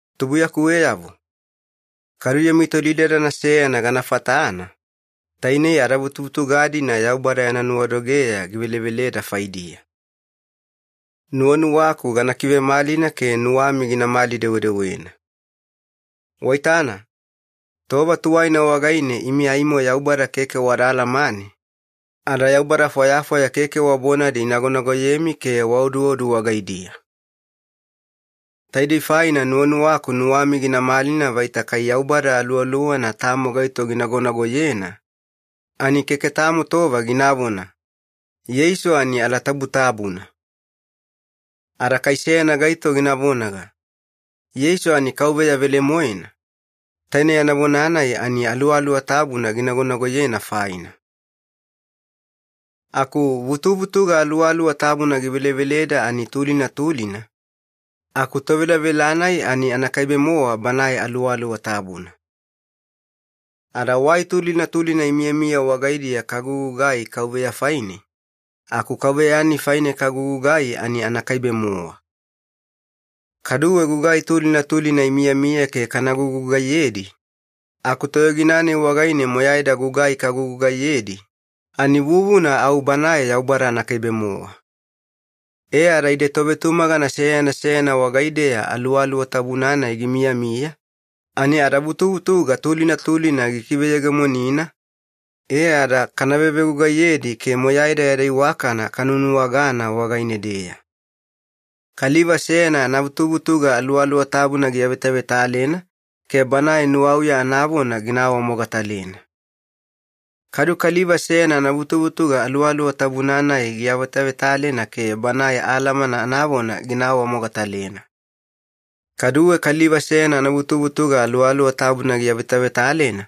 Tubuiyakuweyavo, kadu yami tolidadana seyana gana fatana, tainei adavutuvutuga-dina Yaubada yana nuwadogeya giveleveleda faidiya. Nuwanuwaku gana kivemalina ke nuwami ginamali-dewedewena. Waitana, tova tuwaina wagaine imi aimo Yaubada keke wada alamane, ada yaubada fwayafwaya keke wa bonadi inagonagoyemi ke waoduodu wagaidiya. Taidei faina nuwanuwaku nuwami gina malina vaita kai Yaubada Aluwaluwana tamo gaito ginagonagoyena, ani keke tamo tova ginavona, “Yeisu ani alatabutabuna.” Ada kai seyana gaito gina vonaga, “Yeisu ani Kauveya velemoena,” taine yana vona-nai ani Aluwaluwa Tabuna ginagonagoyena faina. Aku vutuvutuga Aluwaluwa Tabuna giveleveleda ani tulina tulina, aku tovelavela-nai ani anakaibe-mowa Banae Aluwaluwa Tabuna. Ada wai tulina tulina imiyamiya wagaidiya kagugugai Kauveya faine, aku Kauveya-nai faine kagugugai ani anakaibe-mowa. Kaduwe gugai tulina tulina imiyamiya ke kana gugugaiyedi, aku toyogina-nai wagaine moyaida gugai kagugugaiyedi, ani vuvuna au Banae Yaubada anakaibe-mowa. E ada ide tovetumagana seyana seyana wagaideya Aluwaluwa Tabuna-nai gimiyamiya, ani adavutuvutuga tulina tulina gikiveyegemonina e ada kana vevegugaiyedi ke moyaida yada iwakana kanuwanuwagana wagaine-deya. Kaliva seyana anavutuvutuga Aluwaluwa Tabuna giavetavetalena ke banae nuwauya anavona gina awamogatalena. Kadu kaliva seyana anavutuvutuga Aluwaluwa Tabuna-nai giavetavetalena ke banae alamana anavona gina awamogatalena. Kaduwe kaliva seyana anavutuvutuga Aluwaluwa Tabuna giavetavetalena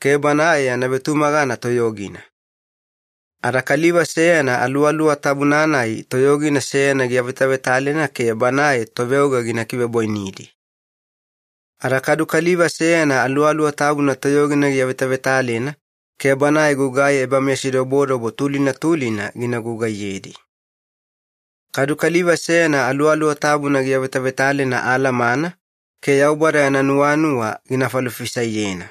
ke banae yana vetumagana toyogina. Ada kaliva seyana Aluwaluwa Tabuna-nai toyogina seyana giavetavetalena ke banae toveoga gina kivebwainidi. Ada kadu kaliva seyana Aluwaluwa Tabuna toyogina giavetavetalena ke banae gugai ebameyasidobodobo tulina tulina gina gugaiyedi. Kadu kaliva seyana Aluwaluwa Tabuna giavetavetalena alamana ke Yaubada yana nuwanuwa gina falofisaiyena.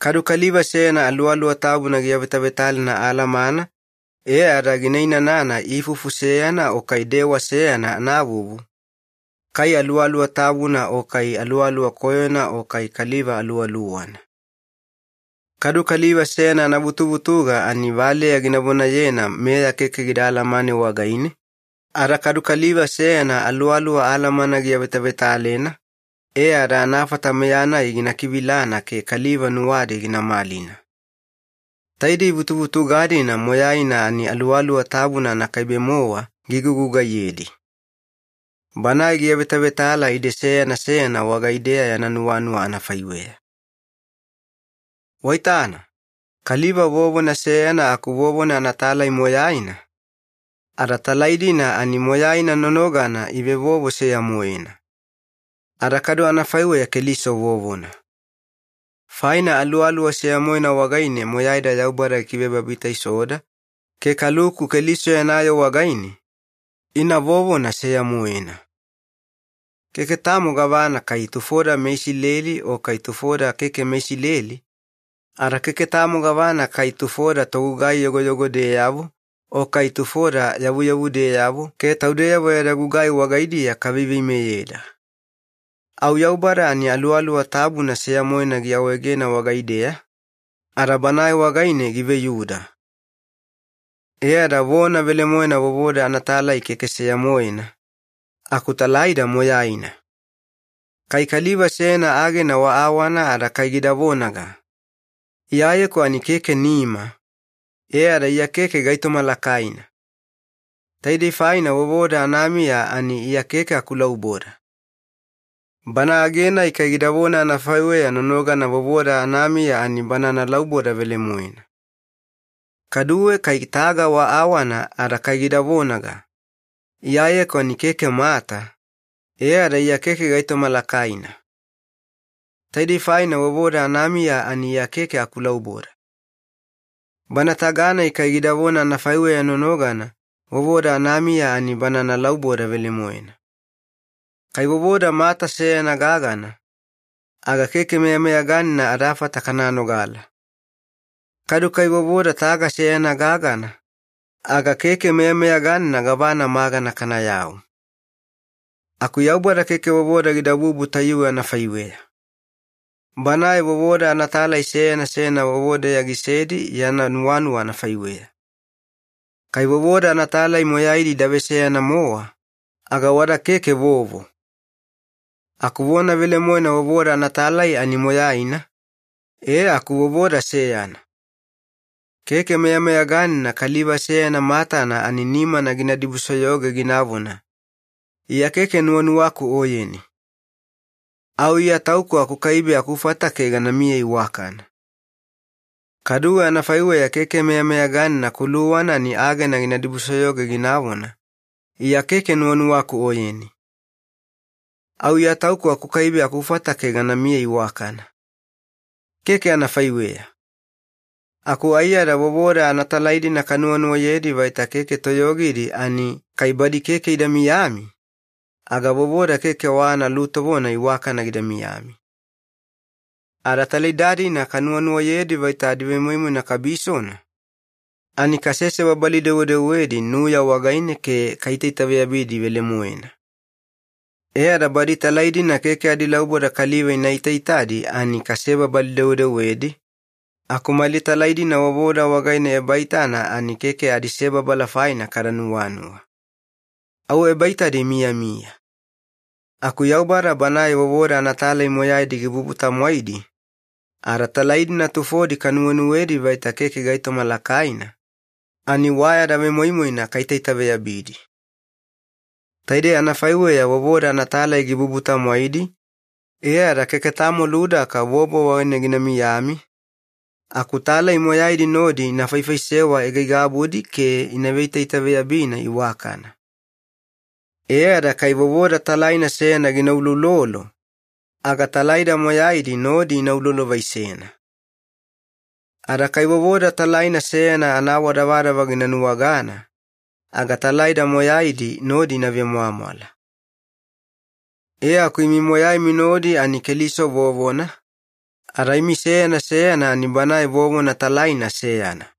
Kadu kaliva seyana Aluwaluwa Tabuna giavetavetalena alamana e ada gina inanana ifufu seyana o kai dewa seyana anavuvu, kai Aluwaluwa Tabuna o kai aluwaluwa koyona o kai kaliva aluwaluwana. Kadu kaliva seyana anavutuvutuga ani valeya gina vonayena meya keke gida alamane wagaine, ada kadu kaliva seyana Aluwaluwa alamana giavetavetalena e ada anafata meya-nai gina kivilana ke kaliva nuwadi gina malina. Taidei vutuvutuga-dina moyaina ani Aluwaluwa Tabuna anakaibe-mowa gigugugaiyedi. Banae giavetavetala ide seyana seyana wagaideya yana nuwanuwa anafaiweya. Waitana, kaliva vovona seyana aku vovona anatalai moyaina, ada talai-dina ani moyaina nonogana ivevovo seya-moena. Ada kadu anafaiweya Keliso vovona. Faina Aluwaluwa seya-moena wagaine moyaida Yaubada gikivebabitaisoda ke kaluku Keliso yana yoo wagaine, ina vovona seya-moena. Keke tamo gavana kai tufoda meIsileli o kai tufoda keke meIsileli, ada keke tamo gavana kai tufoda togugai yogoyogodeyavo o kai tufoda yavuyavudeyavo ke taudeyavo yada gugai wagaidiya kaveiveimeyeda. Au Yaubada ani Aluwaluwa Tabuna seya-moena giawaegena wagaideya, ada Banae wagaine giveyuda. E ada vona velemoena vovoda anatalai keke seya-moena, aku talaida moyaina. Kai kaliva seyana agena wa awana ada kai gida vonaga, “Iyayeku ani keke nima, e ada Iya keke gaitoma lakaina. Taidei faina vovoda anamiya ani Iya keke akulauboda.” Bana age-nai kai gidavona anafaiweya nonogana vovoda anamiya ani bana analauboda velemoena. Kaduwe kai taga wa awana ada kai gida vonaga, “Iyayeku ani keke mata, e ada Iya keke gaitoma lakaina. Taidei faina vovoda anamiya ani Iya keke akulauboda.” Bana taga-nai kai gidavona anafaiweya nonogana vovoda anamiya ani bana analauboda velemoena. Kai vovoda mata seyana gagana, aga keke meyameyaganina adafata kana nogala. Kadu kai vovoda taga seyana gagana, aga keke meyameyaganina gavana magana kanayau. Aku Yaubada keke vovoda gidabubu tayuwe anafaiweya. Banae vovoda anatalai seyana seyana vovodeya gisedi yana nuwanuwa anafaiweya. Kai vovoda anatalai moyaidi ida veseyana-mowa, aga wada keke vovo. Aku vona velemoena vovoda anatalai ani moyaina, e aku vovoda seyana. Keke meyameyaganina kaliva seyana matana ani nimana gina dibusoyoge ginavona, “Iya keke nuwanuwaku oyeni. Au Iya tauku akukaibe akufata ke ganamiya iwakana.” Kaduwe anafaiweya keke meyameyaganina kuluwana ani agena gina dibusoyoge ginavona, “Iya keke nuwanuwaku oyeni. Au Iya tauku akukaibe akufata ke ganamiya iwakana.” Keke anafaiweya. Aku aiyada vovoda anatalai-dina kanuwanuwayedi vaita keke toyogidi ani kai badi keke ida miyami, aga vovoda keke wa analutovona iwakana gida miyami. Ada talaida-dina kanuwanuwayedi vaita adivemoimoina kabisona, ani kasesebabali-dewedewedi nuya wagaine ke kaitaitaveyabidi velemoena. E ada badi talai-dina keke adilauboda kaliva ina itaitadi ani kasebabali-dewedewedi, aku mali talai-dina vovoda wagaine ebaitana ani keke adisebabala faina kada nuwanuwa. Au ebaitadi imiyamiya. Aku Yaubada Banae vovoda anatalai moyaidi gibubu-tamwaidi, ada talai-dina tufodi kanuwenuwedi vaita keke gaitoma lakaina, ani wa yada vemoimoina kaitaitaveyabidi. Taidei anafaiweya vovoda anatalai gibubu-tamwaidi e ada keke tamo ludaka vovo wagaine gina miyami, aku talai moyaidi nodi ina faifaisewa aigaigabudi ke ina veitaitaveyabina iwakana. E ada kai vovoda talaina seyana gina uloulolo, aga talaida moyaidi nodi ina ulolovaisena. Ada kai vovoda talaina seyana anaawadavadava gina nuwagana, aga talaida moyaidi nodi ina vemwamwala. E aku imi moyaimi nodi ani Keliso vovona, ada imi seyana seyana ani Banae vovona talaina seyana.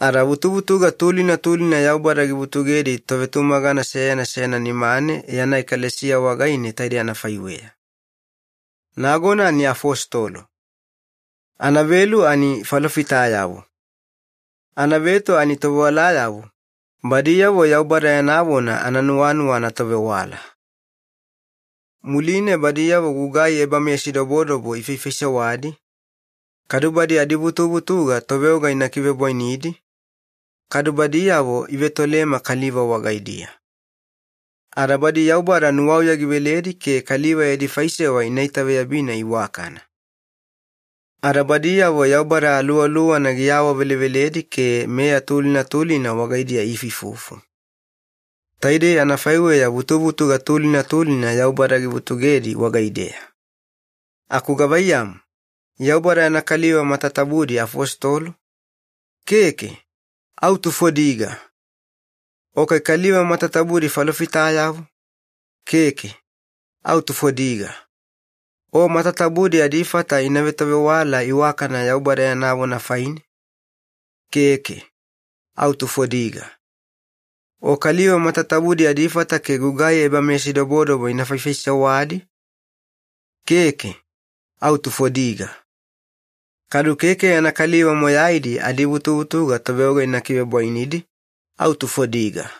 Ada vutuvutuga tulina tulina Yaubada givutugedi tovetumagana seyana seyana nimane yana ekalesiya wagaine taidei anafaiweya. Nagona ani afositolo. Anavelu ani falofitayavo. Anaveto ani tovewalayavo, badiyavo Yaubada yana vona ananuwanuwa anatovewala. Muline badiyavo gugai ebameyasidobodobo ifaifaisewadi, kadu badi adivutuvutuga toveoga ina kivebwainidi, kadu badiyavo ivetoleme kaliva wagaidiya. Ada badi Yaubada nuwauya giveledi ke kaliva yadi faisewa ina itaveyabina iwakana. Ada badiyavo Yaubada Aluwaluwana giawaveleveledi ke meya tulina tulina wagaidiya iifuifufu. Taidei anafaiweya vutuvutuga tulina tulina Yaubada givutugedi wagaideya. Aku gavaiyamu, Yaubada yana kaliva matatabudi afositolo? Keke, au tufodiga. O kai kaliva matatabudi falofitayavo? Keke, au tufodiga. O matatabudi adifata ina vetovewala iwakana Yaubada yana vona faine? Keke, au tufodiga. O kaliva matatabudi adifata ke gugai ebameyasidobodobo ina faifaisewadi? Keke, au tufodiga. Kadu keke yana kaliva moyaidi adivutuvutuga toveoga ina kivebwainidi, au tufodiga.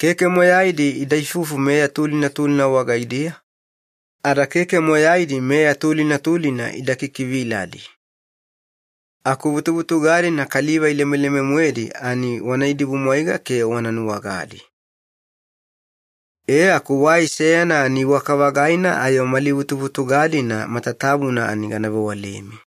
Keke moyaidi ida ifufu meya tulina tulina wagaidiya, ada keke moyaidi meya tulina tulina ida kikiviladi. Aku vutuvutuga-dina kaliva ilemeleme-moedi ani wana idibumwaiga ke wana nuwagadi. E aku wai seyana ani iwaka-vagaina ayo mali vutuvutuga-dina matatabuna ani gana vewalemi.